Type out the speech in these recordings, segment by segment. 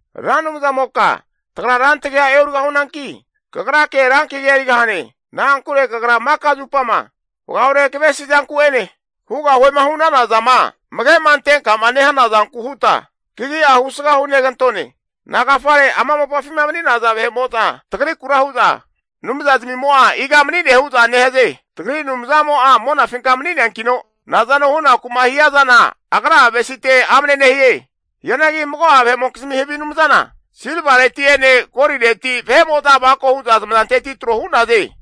Ra Anumzamoka tagra rantagia e'origahunanki, kagrake rankagia erigahane. Na'ankure kagra maka zupama vagaore kavesi zanku'ene, hugahuema hu'nana zama amage'ma antenkama nehana zanku huta, kagi'a husga hunegantone. Nagafare ama mopafima mani'naza vahe'mo'za tagrikura hu'za, Anumza zamimo'a iga mani'ne hu'za nehaze? Tagri Anumzamo'a monafinka mani'neankino nazano hunaku'ma hiazana agra'a avesite amne nehie. Hianagi mago'a vahe'mokizmi havi anumzana, silvareti'ene golireti vahe'mo'za avako hu'za zamazanteti tro hu'naze.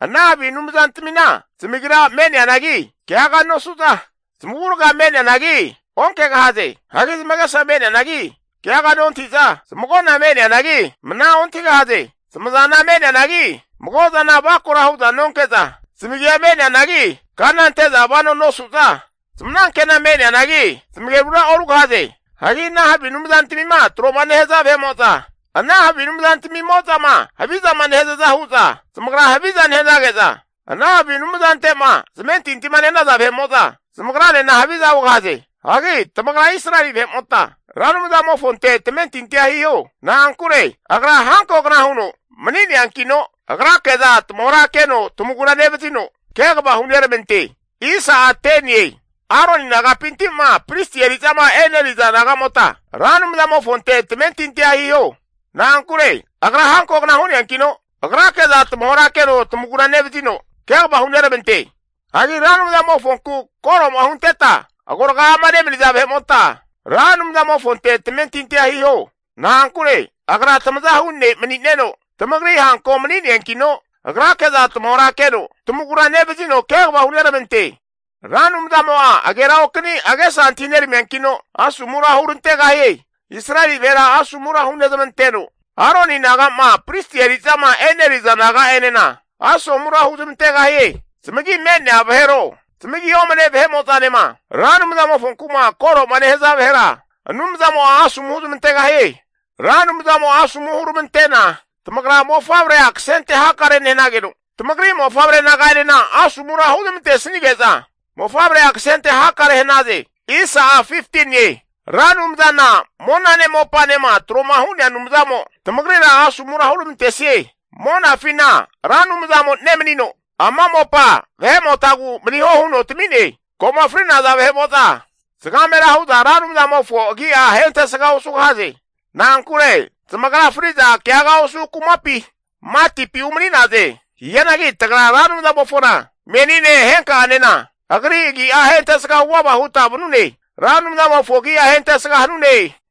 Ana havi anumzantamina zamagira me'neanagi, keaga nosu'za, zamavurga me'neanagi, onkegahaze. Hagi zamagesa me'neanagi keaga nontahi'za, zamagona me'neanagi mna ontahigahaze. Zamazana me'neanagi mago zana avakora hu'za nonke'za, zamagia me'neanagi kana ante'za vanoa nosu'za, zamanankena me'neanagi, zamagerura orugahaze. Hagi ana havi anumzantamima tro'ma nehaza vahe'mo'za ana havi anumzantamo'zama havizama nehazaza hu'za zamagra haviza nehanage'za, ana havi anumzante'ma zamentintima nehanaza vahe'mo'za zamagranena haviza hugahaze. Hagi tamagra Israeli vahe'mota Ra Anumzamofonte tamentintia hiho. Na'ankure agra hankogna huno mani'neankino, agrake'za tamahorakeno tamagura nevazino kegava huneramante. Aroni nagapinti'ma pristi eri'zama e'neriza nagamota, Ra Anumzamofonte tamentintia hiho. Na'ankure agra hankogna hu'neankino agrake'za tamahorakeno tamagura nevazino, kegava huneramante. Hagi Ra Anumzamofonku koro'ma hunteta agoraga'ama nemaniza vahe'mota, Ra Anumzamofonte tamentintia hiho. Na'ankure Agra tamazahu ne' mani'neno tamagri hanko mani'neankino, Agrake'za tamahora keno tamagura nevazino kegava huneramante. Ra Anumzamo'a ageraokani agesa antahi neramiankino, asomura hurantegahie. Israeli vahera asomura hunezmanteno, Aroni naga'ma pristi eri'zama e'neriza naga'enena asomura huzmantegahie. Zamagi me'nea vahero zamagi omane vahe'mo'zanema, Ra Anumzamofonkuma koro'ma nehaza vahera Anumzamo'a asomu huzmantegahie. Ra Anumzamo'a asomu huramantena tamagra mofavrea kasente hakare nehanageno, tamagri mofavre naga'enena asomura huzmantesnige'za mofavrea kasente hakare hanaze. Ra Anumzana monane mopanema tro'ma hu'nea Anumzamo tamagrira asomura huramantesie. Monafina Ra Anumzamo nemanino, ama mopa vahemotagu maniho huno tami'ne. Ko'ma fri'naza vahe'mo'za zagamera hu'za Ra Anumzamofo agi'a ahentesga osugahaze. Na'ankure zamagra fri'za keaga osu kumapi, matipi umani'naze Hianagi tagra Ra Anumzamofona menine henka'anena agri agi'a ahentesga huvava huta vanune. Ra Anumzamofo agi'a ahentesga hanune!